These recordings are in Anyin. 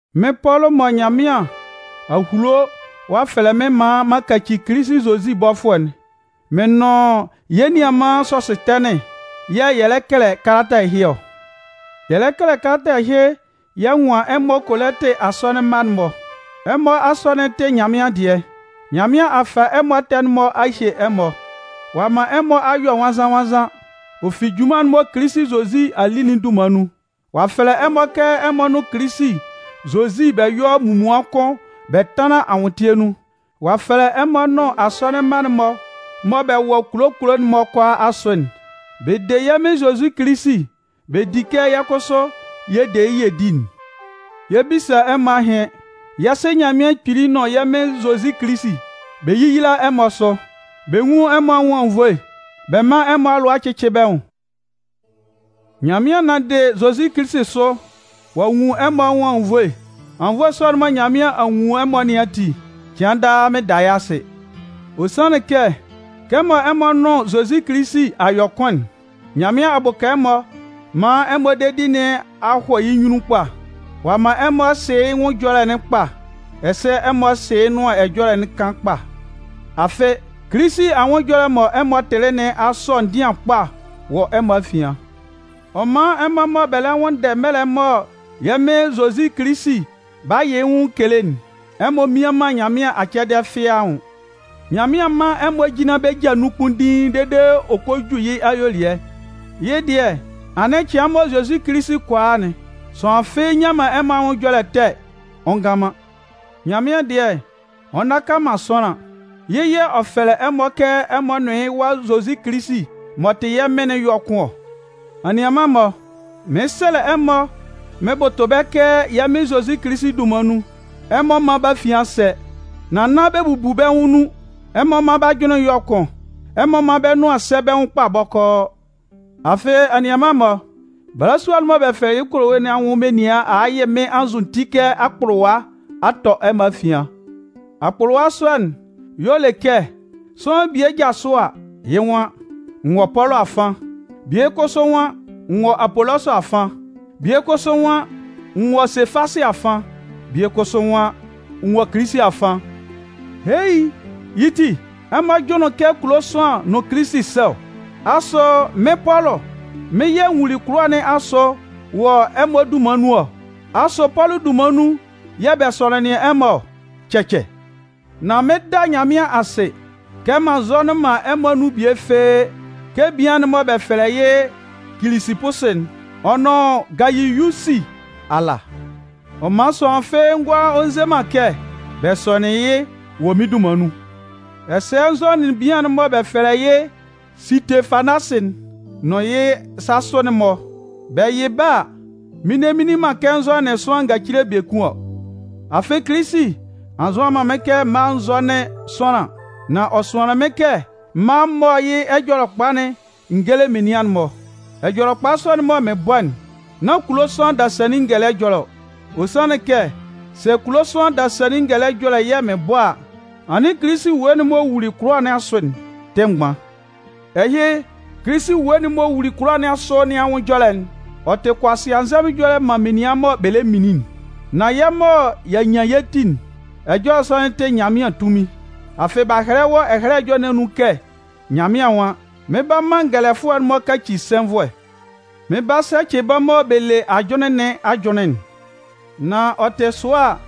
Mɩ́n Pɔlʋ mɔ Nyanmɩan a hulo ɔ'a fɛlɛ mɩ́n maan m'an kaci Kilisi Zozi bɔfʋɛ'n, mɩn nʋn yɛ́ nianman Sɔsʋtɛnɩn, yɛ́ yɛ̂ yɛ lɛ kɛlɛ kalata ɛhɩ ɔ. Yɛ lɛ kɛlɛ kalata ɛhɩ yɛ nwan ɛmɔ Kolɩntɩ asɔnɩn mma'n-mɔ. Ɛmɔ asɔnɩn'n tɩ Nyanmɩan dɩɛ. Nyanmɩan a fa ɛmɔ ɛtɛ'n-mɔ ɔ'a hye ɛmɔ, ɔ'a man ɛmɔ a yɔ nwannzan-nwannzan, ɔ fi junman'n mɔ Kilisi Zozi a li'n dunman nun. Ɔ'a fɛlɛ ɛmɔ kɛ ɛmɔ nʋn Kilisi Zozi bɛ yɔ́ munmuan kʋn bɛ tánlan anwʋntɩɛ nun. Ɔ'a fɛlɛ ɛmɔ nʋn asɔnɩn mma'n-mɔ mɔ bɛ wɔ kulo kulo'n-mɔ kʋalaa asʋ'n. Bɛ de yɛ́ Mɩn Zozi Kilisi bɛ di kɛ yɛ́ kʋsʋ yɛ de yɩ́ yɛ di'n. Yɛ 'bisa ɛmɔ ahɩn. Yɛ́ Sɩ Nyanmɩan Kpili nʋn yɛ́ Mɩn Zozi Kilisi, bɛ yéyila ɛmɔ sʋ, bɛ nwún ɛmɔ anwʋn anwunnvoe, bɛ mán ɛmɔ alʋa cɩ́cɩ bɛ́ nwʋn. Nyanmɩan nanndɩ Zozi Kilisi sʋ ɔ'a nwun ɛmɔ anwʋn anwunnvoe. Anwunnvoe sɔ'n mɔ Nyanmɩan a nwun ɛmɔ nɩn ati, cɩan daa mɩn da yɩ́ asɩ. Ɔ sanlɩn kɛ, kɛmɔ ɛmɔ nʋn Zozi Kilisi a yɔ kʋn'n, Nyanmɩan a bʋka ɛmɔ man ɛmɔ dedi nɩn a hɔ yɩ́ nyunnun kpa. Ɔ a man ɛmɔ sɩ yɩ́ nwʋn ɛjɔlɛ'n kpa, ɛsɛ ɛmɔ sɩ yɩ́ nʋan ɛjɔlɛ'n kan kpa. Afɩ, Kilisi anwʋn ɛjɔlɛ'n mɔ ɛmɔ tɩlɩ nɩn a sɔ ndɩan kpa wɔ ɛmɔ afian. Ɔ man ɛmɔ mɔ bɛ lɛ nwʋnndɛ mɛlɛ mɔ yɛ́ Mɩn Zozi Kilisi 'ba yɩ yɩ́ nwʋn kele'n, ɛmɔ mmian man Nyanmɩan acɛdɩɛ fɩ́ɩ́ anwʋn. Nyanmɩan 'man ɛmɔ jinlan bɛ́ ja nun kpunndiin dede ɔ kɔ ju yɩ́ ayuelɩɛ. Yɩ́ dɩɛ anɩn cɩan mɔ Zozi Kilisi kɔ a'n, sʋanlan fɩ́ɩ́ nnyan man ɛmɔ anwʋn ɛjɔlɛ ɛtɛ ɔ ngan man. Nyanmɩan dɩɛ, ɔ nnaka man sʋanlan. Yɩ́ yɛ̂ ɔ'a fɛlɛ ɛmɔ kɛ ɛmɔ nʋn yɩ́ Wa Zozi Kilisi m'ɔ tɩ yɛ́ Mɩn'n yɔ́ kʋn ɔ. Anianman-mɔ, mɩn 'sɛlɛ ɛmɔ mɩn bʋtʋ bɛ́ kɛ yɛ́ Mɩn Zozi Kilisi dunman nun, ɛmɔ mán bɛ́ afian sɛ́, nan nán bɛ bubu bɛ́ nwʋn nun. Ɛmɔ mán bɛ́ ajʋnlɩn yɔ́ kʋn. Ɛmɔ mán bɛ́ nʋan sɛ́ bɛ́ nwʋn kpa bɔkɔɔ. Afɩ, anianman-mɔ, balasua'n mɔ bɛ fɛlɛ yɩ́ Kolowe nɩn anwʋn menian a a yɩ mɩ́n anzʋti kɛ akpʋlʋwa a tɔ ɛmɔ afian. Akpʋlʋwa sɔ'n y'ɔ le kɛ sʋanlan bie jasʋ a, yɩ́ nwan: “N wɔ Pɔlʋ afan”, bie kʋsʋ nwan: “N wɔ Apolɔsʋ afan”, bie kʋsʋ nwan: “N wɔ Sefasɩ afan”, bie kʋsʋ nwan: “N wɔ Kilisi afan.” Hei! Yɩ́ ti, ɛmɔ jʋnlɩn kɛ kulo sʋanlan nʋn Kilisi sɛ ɔ? Asʋ mɩ́n, Pɔlʋ, mɩ́n yɛ̂ n wuli kʋlʋwa nɩn asʋ wɔ ɛmɔ dunman nun ɔ? Asʋ Pɔlʋ dunman nun yɛ̂ bɛ sɔnɩnlɩn ɛmɔ ɔ? Cɛcɛ! Nan mɩn 'da Nyanmɩan asɩ kɛ m'an nzɔnɩn man ɛmɔ anun bie fɩ́ɩ́ kɛ bian'n mɔ bɛ fɛlɛ yɩ́ Kilisipusi'n ɔ nʋn Gayiyusi ala. Ɔ man sʋanlan fɩ́ɩ́ ngʋala ɔ nze man kɛ bɛ sɔnɩnlɩn yɩ́ wɔ mɩ́n dunman nun. Ɛsɛ n zɔnɩnlɩn bian'n mɔ bɛ fɛlɛ yɩ́ Sɩtefanasɩ'n nʋn yɩ́ sasʋ'n-mɔ. Bɛ yɩ bɛ́ a, mɩn nne nni man kɛ n zɔnɩnlɩn sʋanlan ngacile biekun ɔ. Afɩ Kilisi a nzʋan man mɩ́n kɛ m mála n zɔ́nɩn sʋanlan. Nan ɔ sʋanlɩn mɩ́n kɛ m mála m mɔ́ yɩ́ Ɛjɔlɛkpa'n n géle menian'n-mɔ. Ɛjɔlɛkpa sɔ'n mɔ mɩn bɔ'n, nán kulo sʋanlan dasannin ngɛlɛ ɛjɔlɛ ɔ. Ɔ sanlɩn kɛ sɛ kulo sʋanlan dasannin ngɛlɛ ɛjɔlɛ yɛ̂ mɩn bɔ a, anɩn Kilisi ewue'n m'ɔ wuli kʋlʋwa nɩn asʋ'n tɩ mgban. Ɛhɩ, Kilisi ewue'n m'ɔ wuli kʋlʋwa nɩn asʋ nɩn anwʋn ɛjɔlɛ'n, ɔ tɩ kʋasɩanzɛmʋn ɛjɔlɛ man menian mɔ bɛ lɛ minlin'n. Nan yɛ́ mɔ y'a nyan yɛ́ ti'n, ɛjɔlɛ sɔ'n tɩ Nyanmɩan tunmin. Afɩ b'a hɛlɛ wɔ Ɛhɛlɛ Ɛjɔlɛ nɩn anun kɛ Nyanmɩan nwan: Mɩn 'ba man ngɛlɛfʋɛ'n-mɔ kaci sɛnvʋɛ. Mɩn 'ba sɛcɩ bɛ́ mɔ bɛ le ajʋnlɩn nɩn ajʋnlɩn'n. Nan ɔ tɩ sʋa a,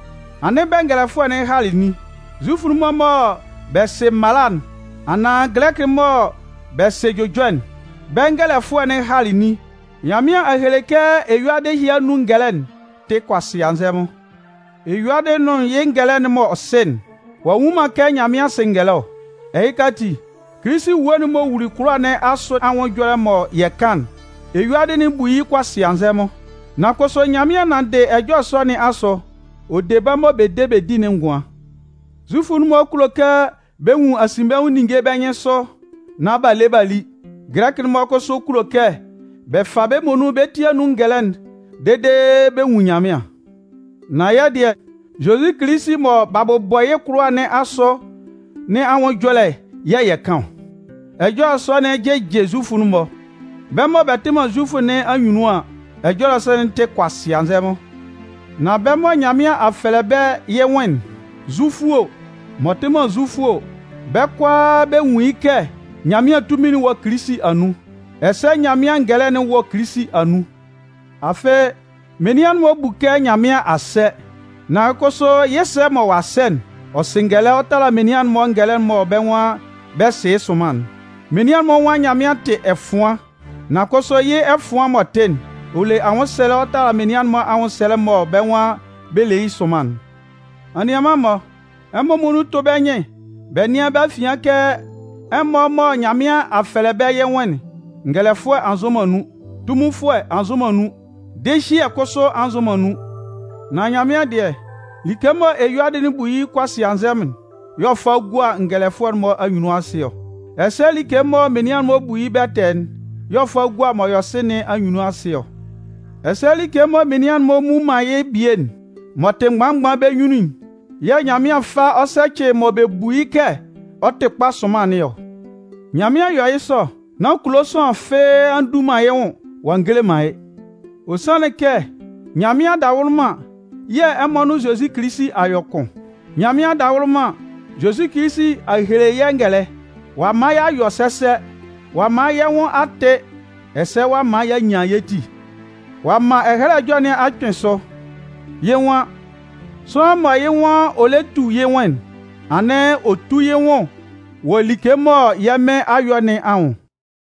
anɩn bɛngɛlɛfʋɛ'n halɩ nin? Zufʋ'n-mɔ mɔ bɛ sɩ mala'n anaan Gɛlɛkɩ'n-mɔ mɔ bɛ sɩ jʋjɔ'n, bɛ́ bɛngɛlɛfʋɛ'n halɩ nin? Nyanmɩan a hele kɛ eyuadɩ ɛhɩ anun ngɛlɛ'n tɩ kʋasɩanzɛmʋn! Eyuadɩ'n nʋn yɩ́ ngɛlɛ m'ɔ sɩ'n, ɔ'a nnwun man kɛ Nyanmɩan sɩ ngɛlɛ ɔ. Ɛhɩka ati, Kilisi ewue'n m'ɔ wuli kʋlʋwa nɩn asʋ anwʋn ɛjɔlɛ'n mɔ yɛ kan'n, eyuadɩ'n bu yɩ́ kʋasɩanzɛmʋn. Nan kʋsʋ Nyanmɩan nanndɩ ɛjɔlɛ sɔ nɩn asʋ, ɔ de bɛ́ mɔ bɛ de bɛ di'n ngʋan. Zufʋ'n-mɔ kulo kɛ bɛ nwun asinbɛnwʋn ninnge bɛ́ nyɩnsʋ nán b'a le b'a li. Gɛlɛkɩ'n-mɔ kʋsʋ kulo kɛ bɛ fa bɛ́ muonun bɛ́ ti anun ngɛlɛ'n dede bɛ nwun Nyanmɩan. Nan yɛ́ dɩɛ, Zozi Kilisi mɔ b'a bʋbɔ yɩ́ kʋlʋwa nɩn asʋ nɩn anwʋn ɛjɔlɛ yɛ̂ yɛ kan ɔ. Ɛjɔlɛ sɔ'n jɩjɩ Zufʋ'n-mɔ. Bɛ́ mɔ bɛ tɩ man Zufʋ nɩn anyunnun an, ɛjɔlɛ sɔ'n tɩ kʋasɩanzɛmʋn. Nan bɛ́ mɔ Nyanmɩan a fɛlɛ bɛ́ yɩ́ nwʋn'n, Zufʋ o, m'ɔ tɩ man Zufʋ o, bɛ́ kʋalaa bɛ nwun yɩ́ kɛ Nyanmɩan tunmin'n wɔ Kilisi anun, ɛsɛ Nyanmɩan ngɛlɛ'n wɔ Kilisi anun. Afɩ, menian'n-mɔ bu kɛ Nyanmɩan a sɛ. Nan kʋsʋ yɩ́ ɛsɛɛ mɔ ɔ'a sɛ'n, ɔ sɩ ngɛlɛ ɔ tala menian'n-mɔ ngɛlɛ mɔ bɛ́ nwan bɛ sɩ yɩ́ sʋnman'n. Menian'n-mɔ nwan Nyanmɩan tɩ ɛfʋan. Nan kʋsʋ, yɩ́ ɛfʋan m'ɔ tɩ'n, ɔ le anwʋnsɛlɛ ɔ tala menian'n-mɔ anwʋnsɛlɛ mɔ bɛ́ nwan bɛ le yɩ́ sʋnman'n. Anianman-mɔ, ɛmɔ muonun tʋ́ bɛ́ nyɩn bɛ nɩ́an bɛ́ afian kɛ ɛmɔ mɔ Nyanmɩan a fɛlɛ bɛ yɩ́ nwʋn'n, ngɛlɛfʋɛ a nzʋn man nun, tunminfʋɛ a nzʋn man nun, dɩhyɩɛ kʋsʋ a nzʋn man nun. Nan Nyanmɩan dɩɛ, like mɔ eyuadɩ'n bu yɩ́ kʋasɩanzɛmʋn'n y'ɔ fa ɔ gua ngɛlɛfʋɛ'n-mɔ anyunnun asɩ ɔ. Ɛsɛ like mɔ menian'n bu yɩ́ bɛtɛɛ'n y'ɔ fa gua m'ɔ yɔ sɩ nɩn anyunnun asɩ ɔ. Ɛsɛ like mɔ menian'n-mɔ mmu man yɩ́ bie'n, m'ɔ tɩ mgban mgban bɛ́ nyunnun'n yɛ̂ Nyanmɩan fa ɔ sɛcɩ mɔ bɛ bu yɩ́ kɛ ɔ tɩ kpa sʋnman nɩn ɔ. Nyanmɩan yɔ yɩ́ sɔ nán kulo sʋanlan fɩ́ɩ́ a ndu man yɩ́ nwʋn ɔ'a ngele man yɩ́. Ɔ sanlɩn kɛ Nyanmɩan adawʋlʋman yɛ̂ ɛmɔ nʋn Zozi Kilisi a yɔ kʋn. Nyanmɩan adawʋlʋman, Zozi Kilisi a hele yɛ́ ngɛlɛ. Ɔ'a man y'a yɔ sɛsɛ, ɔ'a man yɛ́ nwʋn a tɩ ɛsɛ ɔ'a man y'a nyan yɛ́ ti. Ɔ'a man Ɛhɛlɛ Ɛjɔlɛ nɩn a kpɩn sʋ. Yɩ́ nwan: Sʋanlan mɔ yɩ́ nwan ɔ lɛ tu yɩ́ nwʋn'n, anɩn ɔ tú yɩ́ nwʋn wɔ like mɔ yɛ́ Mɩn a yɔ nɩn anwʋn.